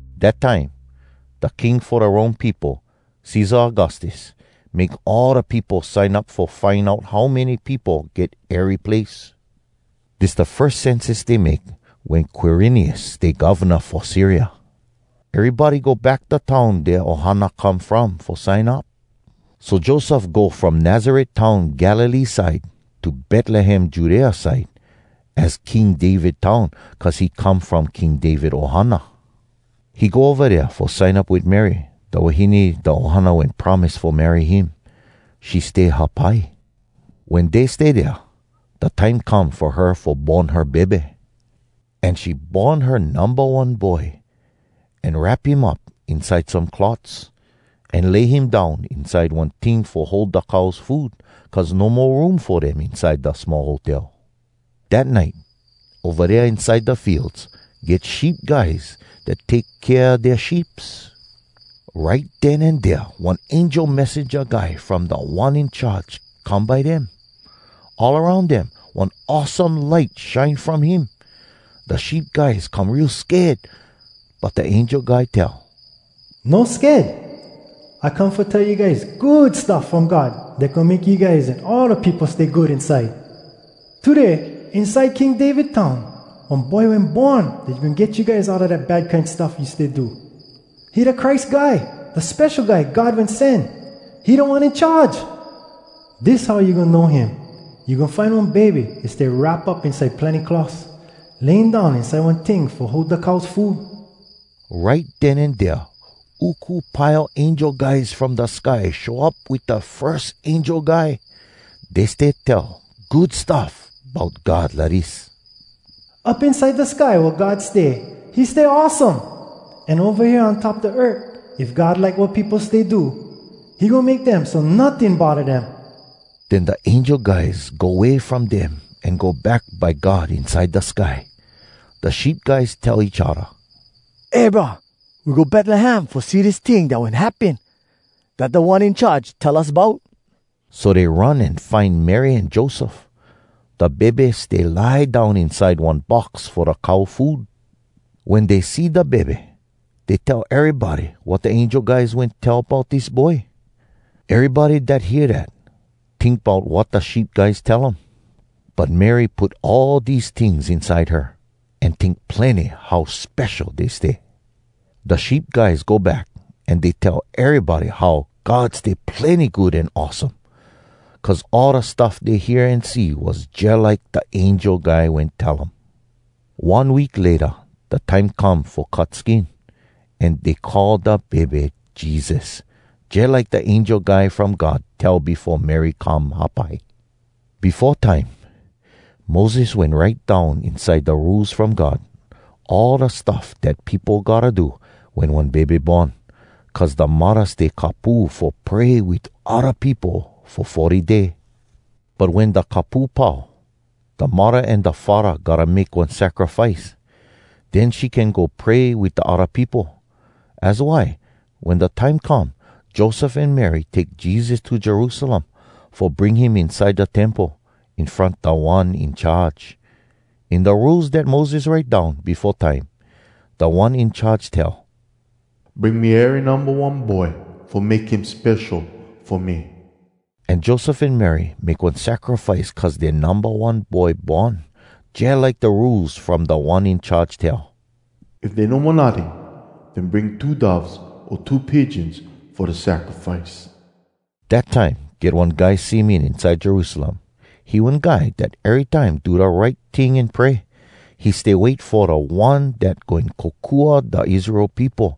Dat time, da king fo da Rome peopo, Cesar Augustus, make all da peopo sign up fo find out how many peopo get ery place. Dis da firs census dey make wen Quirinius stay govna fo Syria. Erybody go back da town dea ohana come from fo sign up. So Joseph go from Nazaret town Galilee side, to Betlehem Judea side. Az King David town, cuz he come from King David ohana. He go ova dea fo sign up wit Mary, da wahine da ohana wen promise fo marry him. She stay hapai. Wen dey stay dea, da time come fo her fo born her bebe. An she born her numba one boy, an wrap him up inside some cloths, an lay him down inside one ting fo hold da cows food, cuz no mo room fo dem inside da small hotel. Dat nite, ova dea inside da fields, get sheep guys dat take kea dea sheeps. Right den an dea one angel messenja guy from Da One In Charge come by dem. All aroun dem one awesome light shine from him. Da sheep guys come real sked. But da angel guy tell, “No sked. I come fo tell you guys Good Stuff From God dat goin make you guys an all da peopo stay good inside. Today inside King David town, one boy wen born dat goin get you guys outa da bad kine stuff you stay do. He da Christ Guy, da Spesho Guy God Wen Sen. He Da One In Charge! Dis how you goin know him. You goin find one bebe dat stay wrap up inside plenny cloths, laying down inside one ting fo hold da cows food.” Right den an dea uku pile angel guys from da sky show up wit da firs angel guy. Dey stay tell good stuff bout God lidis: “Up inside da sky wea God stay, He stay awesome! An ova hea on top da earth, If God like wat peopo stay do, He goin make dem So notting bodda dem.” Den da angel guys go way from dem an go back by God inside da sky. Da sheep guys tell each odda, “Eh brah, we go Betlehem fo see dis ting dat wen happen, dat Da One In Charge tell us bout.” So dey run an find Mary an Joseph. Da bebe stay lie down inside one box fo da cow food. Wen dey see da bebe, dey tell erybody wat da angel guys wen tell bout dis boy. Erybody dat hear dat, tink bout wat da sheep guys tell um. But Mary put all dese tings inside her, an tink plenny how spesho dey stay. Da sheep guys go back, an dey tell erybody how God stay plenny good an awesome. Cuz all da stuff dey hear an see was jalike da angel guy wen tell um. One week layta da time come fo cut skin. An dey call da bebe Jesus, jalike da angel guy from God tell befo Mary come hapai. Befo time, Moses wen write down inside da Rules From God, all da stuff dat peopo gotta do wen one bebe born, cuz da muddah stay kapu fo pray wit odda peopo fo forty day. But wen da kapu pau, da muddah an da faddah gotta make one sacrifice, den she can go pray wit da odda peopo. Az why wen da time come, Joseph an Mary take Jesus to Jerusalem fo bring him inside da Temple, in front Da One In Charge. In da Rules dat Moses write down befo time, Da One In Charge tell, “Bring me ery numba one boy fo make him spesho fo me.” An Joseph an Mary make one sacrifice cuz dea numba one boy born, jalike da Rules from Da One In Charge tell, “If dey no mo notting, den bring two doves o two pigeons fo da sacrifice.” Dat time get one guy Simeon inside Jerusalem. He one guy dat erytime do da right ting an pray. He stay wait fo da One dat goin kokua da Israel peopo.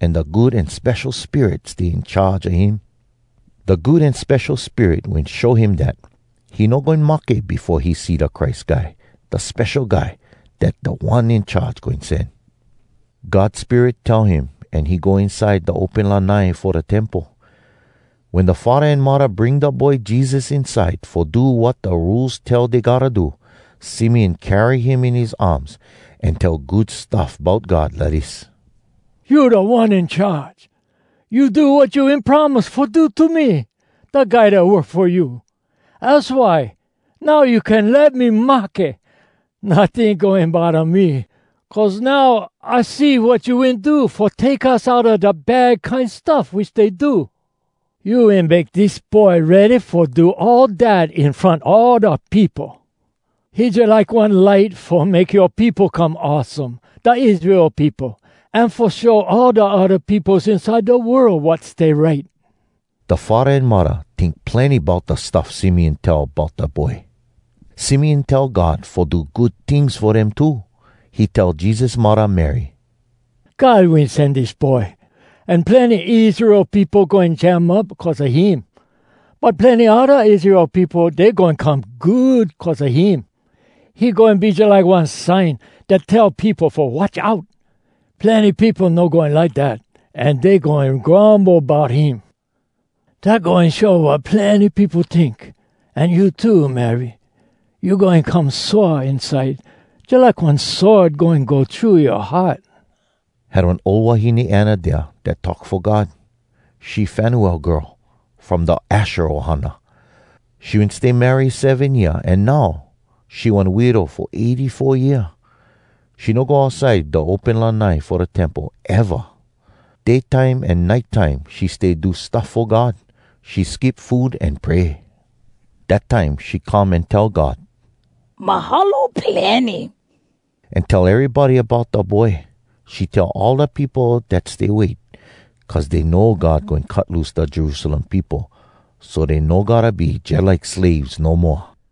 An da Good An Spesho Spirit stay in charge a him. Da Good An Spesho Spirit wen show him dat he no goin mahke befo he see da Christ Guy, da Spesho Guy dat Da One In Charge goin sen. God Spirit tell him an he go inside da open lanai fo da Temple. Wen da faddah an muddah bring da boy Jesus inside fo do wat da Rules tell dey gotta do, Simeon carry him in his arms an tell good stuff bout God lidis: “You, Da One In Charge! You do wat you wen promise fo do To me, da guy dat work fo you. Az why now you can let me mahke. Notting goin bodda me, Cuz now I see wat you wen do Fo take us outa da bad kine stuff we stay do. You wen make dis Boy ready fo do all dat In front all da peopo. He jalike one light Fo make yoa peopo come awesome, Da Israel peopo, An fo show all da odda peopos Inside da world Wat stay right.” Da faddah an muddah tink plenny bout da stuff Simeon tell bout da boy. Simeon tell God fo do good tings fo dem too. He tell Jesus muddah Mary, “God wen sen dis boy, an plenny Israel peopo goin jam up cuz a him. But plenny odda Israel peopo, dey goin come good cuz a him. He goin be jalike one sign dat tell peopo fo watch out. Plenny peopo no goin like dat, an dey goin grumble bout him. Dat goin show wat plenny peopo tink. An you too, Mary, you goin come sore inside, jalike one sword goin go thru yoa heart.” Had one ol wahine Anna dea dat talk fo God. She Fanuel girl, from da Asher ohana. She wen stay marry seven year, an now, she one widow fo eighty-four year. She no go outside da open lanai fo da Temple eva. Day time an nite time she stay do stuff fo God. She skip food an pray. Dat time she come an tell God “Mahalo plenny!” an tell erybody bout da boy. She tell all da peopo dat stay wait, cuz dey know God goin cut loose da Jerusalem peopo so dey no gotta be jalike slaves no moa.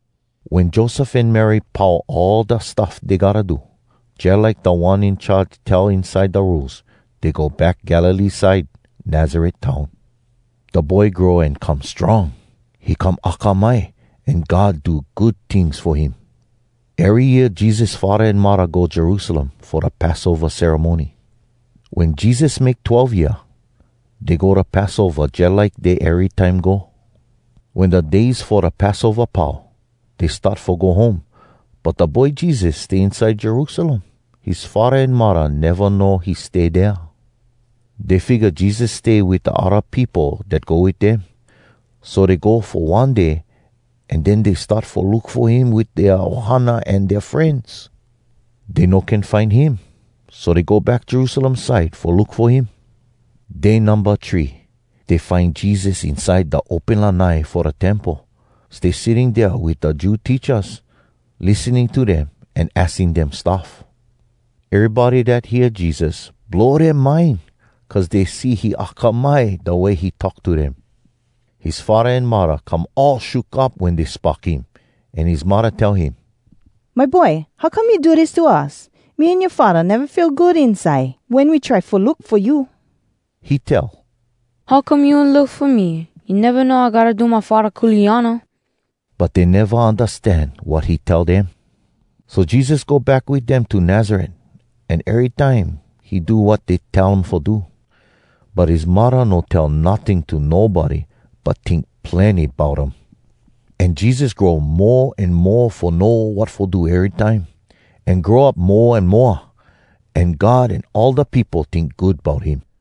Wen Joseph an Mary pau all da stuff dey gotta do, jalike Da One In Charge tell inside da Rules, dey go back Galilee side, Nazaret town. Da boy grow an come strong. He come akamai, an God do good tings fo him. Ery year Jesus faddah an muddah go Jerusalem fo da Passova ceremony. Wen Jesus make twelve year, dey go da Passova jalike dey erytime go. Wen da days fo da Passova pau, dey start fo go home, but da boy Jesus stay inside Jerusalem. His faddah an muddah neva know he stay dea. Dey figga Jesus stay wit da odda peopo dat go wit dem. So dey go fo one day, an den dey start fo look fo him wit dea ohana an dea frenz. Dey no can find him, so dey go back Jerusalem side fo look fo him. Day numba three, dey find Jesus inside da open lanai fo da Temple, stay sitting dea wit da Jew teachas, lissening to dem, an aksing dem stuff. Erybody dat hear Jesus, blow dea mind, cuz dey see he akamai da way he talk to dem. His faddah an muddah come all shook up wen dey spock him, an his muddah tell him, “My boy, how come you do dis to us? Me an yoa faddah neva feel good inside, wen we try fo look fo you.” He tell, “How come you wen look fo me? You neva know I gotta do my Faddah kuleana?” But dey neva undastan wat he tell dem. So Jesus go back wit dem to Nazaret, an erytime he do wat dey tell um fo do. But his muddah no tell notting to nobody, but tink plenny bout um. An Jesus grow mo an mo fo know wat fo do erytime, an grow up mo an moa. An God an all da peopo tink good bout him.